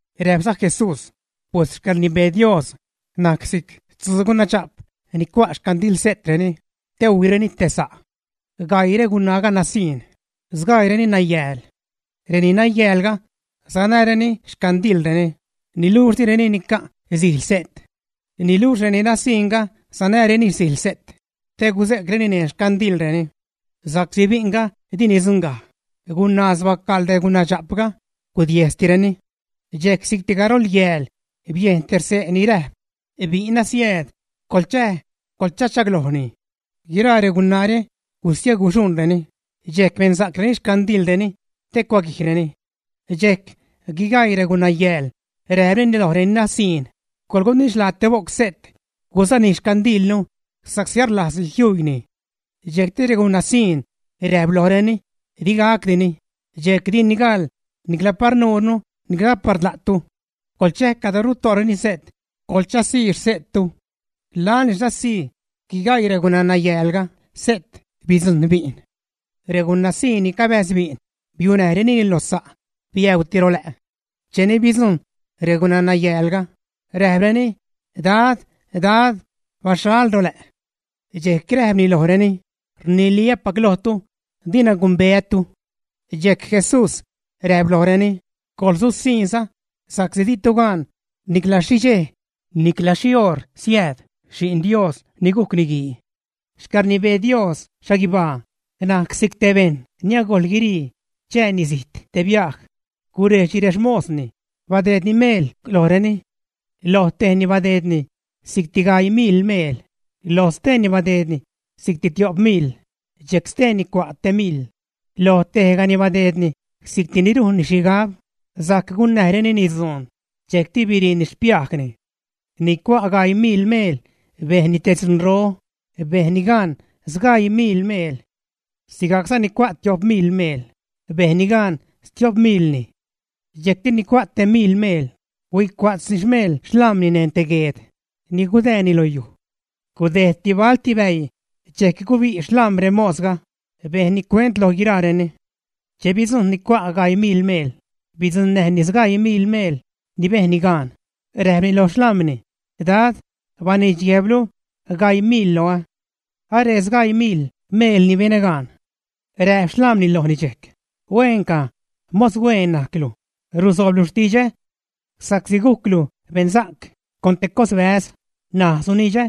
Räjpza Jesús: ―Pues xcäḻrnibee Dios najc si'c tzuu gunadxa'p nani cua' xcandilse'treni te huijreni te sa'. Gaii regunaaga nasiṉ, sgaiireni nayääl. Reni nayäälga sanäreni xcandilreni, niluxh direni nica' sijl se't. Niluxh reni nasiṉga sanäreni sijl se't te guze'creni neṉ xcandilreni. Sa'csi bi'nga di nidzuṉgaj, gunaaz bacaḻ regunadxa'pga, gudiejstireni. Dxejc si'cti garol yääl, biejn te xse' ni räjp: “Bi'n asiääd, coḻchäj, coḻchachaglojni.” Guiraa regunaare huistieguxuṉreni, dxejc bensa'creni xcandilreni, te cuaguijreni. Dxejc guigaii regunayääl räjpreni loj reni nasiṉ: “Coḻgunidxlaa te bo'c se't gusanijnu xcandilnu, sa'csi arlajzni jiuiini.” Dxejcti regunanasiṉ räjp lojreni: “Digacdini, dxejc dini gaḻ nicla par nuurnu nicla par la'tu. Coḻchäj cadro ruto'reni se't coḻchazii xse'ttu.” Laḻni sasii guigaii regunaa-nayäälga se't, bidzujṉ bi'n. Regunaa-siṉ ni cabäjz bi'n biunäjrenini lo sa', biäuuti ro lä'. Cheni bidzujṉ regunanayäälga, räjpreni: “Dad, Dad, baxhal ro lä'.” Dxejc räjpni lojreni: “Rniliä́pac lojtu, dina gumbeätu.” Dxejc Jesús räjp lojreni: ―Coḻsusiṉza, sa'csi ditu gan nicla xhi dxej nicla xhi oṟ siääd Xi'n Dios ni gujc Niguii. ’Xcäḻrnibee Dios xhaguibaa najc si'c te bejṉ ni agojl guirii chääni zijt te biaj. Gurejdxni rexmosni, badeedni meel lojreni. ’Lo tejni badeedni si'cti gaii miḻ meel, lo steeni badeedni si'cti tio'p miḻ, dxejc steeni cua' te miḻ. Loj tejgani badeedni si'cti ni rujnni xhigab sajc gunnäjreni dzuun, dxejcti biriini xpiajni. Ni cua' gaii miḻ meel bejn te dzunro, bejnni gaan sgaii miḻ meel. Sigajcza ni cua' tio'p miḻ meel, bejnni gaan stio'p miḻ. Dxejcti ni cua' te miḻ meel, huicua'tzni xmeel xlam̲ni neṉ te gueed ni gudäänni lo yuj. ’Gudejdti balti bäii, dxejc gubi' xlam̲ remosga, bejnni cuent loj guiraareni. Che bidzujṉ ni cua' gaii miḻ meel, bidzuṉnäjni sgaii miḻ meel ni bejnni gaan, räjpni loj xlam̲ni: “Dad, baniidx guejblu gaii miḻ loä. Aree sgaii miḻ meel ni benä gaan.” Räjp xlam̲ni lojni dxejc: “Hueenca, mos hueen najclu, rusoobzalu xtidxä. Sa'csi gujclu beṉsa'c con te cos bäz, ṉaj sunidxä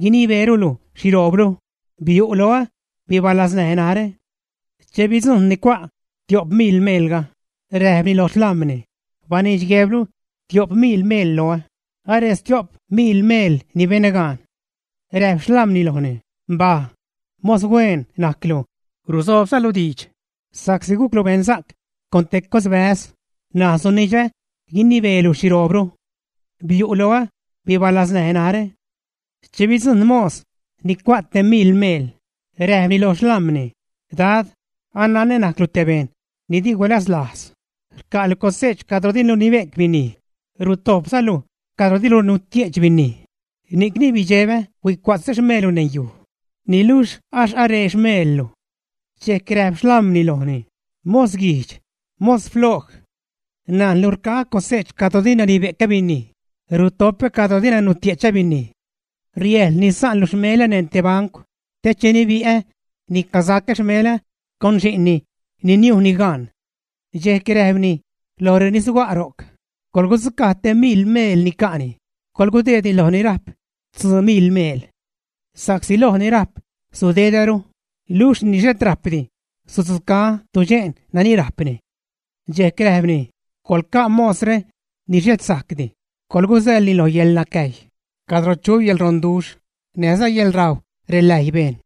guinibeelu xhiroobru. Biu' loä, bibalaznäj narä.” Che bidzujṉni ni cua' tio'p miḻ meelga, räjpni loj xlam̲ni: “Baniidx guejblu tio'p miḻ meel loä, aree stio'p miḻ meel ni benä gaan.” Räjp xlam̲ni lojni: “Mbaj. Mos hueen najclu rusoobzalu diidx. Sa'csi gujclu beṉsa'c con te cosbäz, ṉaj sunidxä guinibeelu xhiroobru. Biu' loä, bibalaznäj narä.” Che bidzujṉ mos ni cua' te miḻ meel, räjpni lo xlam̲ni: “Dad, ananä najclu te bejṉ ni di gulazlajz; rca'lu cose'ch cadro dilu nibe'c binij, rutojpzalu cadro dilu nutie'ch binij. Ni'cni bidxebä, huicua'tzä xmeellu neṉ yuj. Niluxh axh aree xmeellu.” Dxejc räjp xlam̲ni lojni: “¡Mos guijdx, mos ploj! Najnlu rca'ä cose'ch cadro dina nibe'cä binij, rutopä cadro dina nutie'chä binij. Riäjḻ nisa'nlu xmelä neṉ te bancw te che nibi'ä nicasacä xmelä con xi'nni ni niujni gaan.” Dxejc räjpni loj reni suga' ro'c: “Coḻgudzucaj te miḻ meel ni ca'ni coḻgudeedni loj ni rajp tzuu miḻ meel. Sa'csi loj ni rajp sudedäru, niluxh ni xhet rajpdi sudzucaä tudxe'n nani rajpni.” Dxejc räjpni: “Coḻca' mosre ni xhet sajcdi, colguzäḻni lo yäḻnacäjy, cadro chu yäḻronduxh, näjza yäḻrajw reläjy bejṉ.”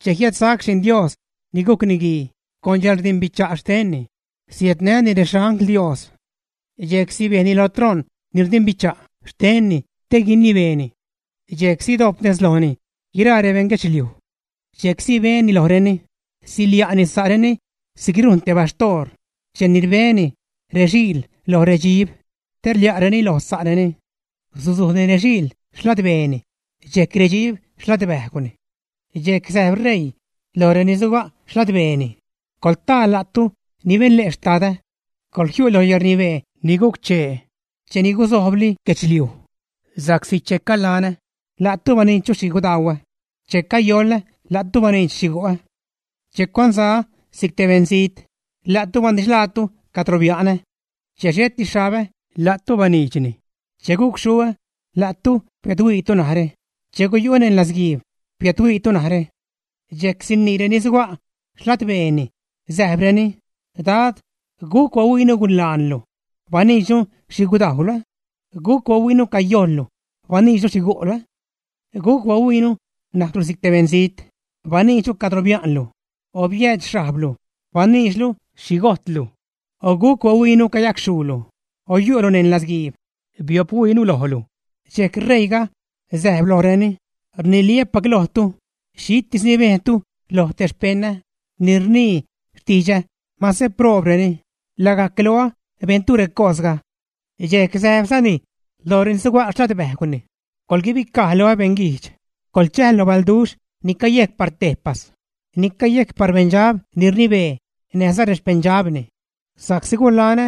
’Che jiädsac Xi'n Dios ni gujc Niguii con yäḻrdimbicha' xtenni, siädnäni rexangl Dios. Dxejc sibejni lo troṉ ni rdimbicha' xtenni te guinibeeni. Dxejc sidojp nez lojni guiraa rebeṉ guedxliuj. Dxejc sibeni lojreni, silia'ni sa'reni si'c rujn te baxtoor cheni rbeni rexiil loj redxib, te rlia'reni loj sa'reni. Suzujni rexiil xladbeeni dxejc redxib xladbäjgwni. Dxejc säjb ṟeii loj reni suga' xladbeeni: “Coḻtaa, la'tu ni beṉle' Xtadä. Coḻjiu' lo yäḻrnibee ni guc-chee cheni guzoblojli guedxliuj. Sa'csi che calanä la'tu baniidx xhi gudauä, che cayolä, la'tu baniidx xhi gu'ä. Che cuanzaä si'c te beṉzijt, la'tu banidxlaatu cadro bia'nä. Che xheti xhabä, la'tu baniidxni, che gucxhuä, la'tu biädhuiitu narä, che guyu'ä neṉ latzguiib, biädhuiitu narä.” Dxejc sinii reni suga' xladbeeni, säjbreni: “Dad, ¿guc bahuiinu gulaanlu, baniidxnu xhi gudajwlu? ¿Guc bahuiinu cayojllu, baniidxnu xhi gu'lu? ¿Guc bahuiinu najclu si'c te beṉzijt, baniidxnu cadro bianlaalu, o biäädx xhajblu, baniidxnu xhi gojtlu? O ¿guc bahuiinu cayacxhuulu, o yu'lu neṉ latzguiib, biophuiinu lojlu?” Dxejc ṟeiiga säjb lojreni: “Rniliä́pac lojtu, xhitis xhi bejntu loj te rexpeṉä ni rnii xtidxä mase proobreni, lagajc loä bejntu recosga.” ’Dxejc säjpzani loj reni suga' ladbäjgwni: “Coḻguibicaj loä, beṉguijdx, coḻchäj lo balduxh ni cayejc par tejpas ni cayejc par beṉdxab ni rnibee näjza rexpeṉdxabni. Sa'csi gulanä,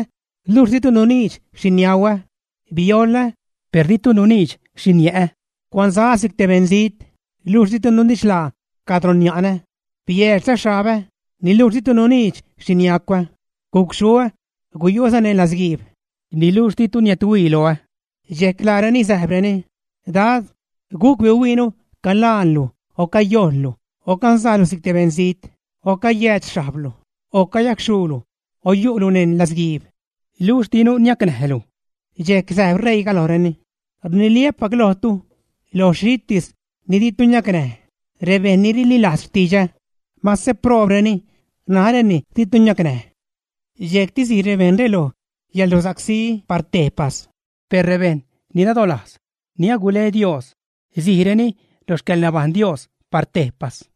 luxh ditu nuniidx xhi niauä; biolä, per ditu nuniidx xhi niä'ä; cuanzaä si'c te beṉzijt, luxh ditu nunidxlaa cadro nia'nä, biädxza xhabä, niluxh ditu nuniidx xhi niacwä; gucxhuä, guyu'äza neṉ latzguiib, niluxh ditu niädhuii loä.” Dxejc laareni säjbreni: “Dad, ¿guc bihuiinu calaanlu, o cayojllu, o canzajlu si'c te beṉzijt, o cayäädx xhajblu, o cayacxhuulu, o yu'lu neṉ latzguiib, luxh dinu niacnäjlu?” Dxejc säjb ṟeiiga lojreni: “Rniliä́pac lojtu, loj xhitis ni ditu niacnäj rebejṉ ni rililajz xtidxä, mase proobreni naräni ditu niacnäj.” Dxejcti sij rebejṉre lo yäḻrusacsí par tejpas, per rebejṉ ni nadolajz, ni agule Dios, sijreni lo xcäḻnabajṉ Dios par tejpas.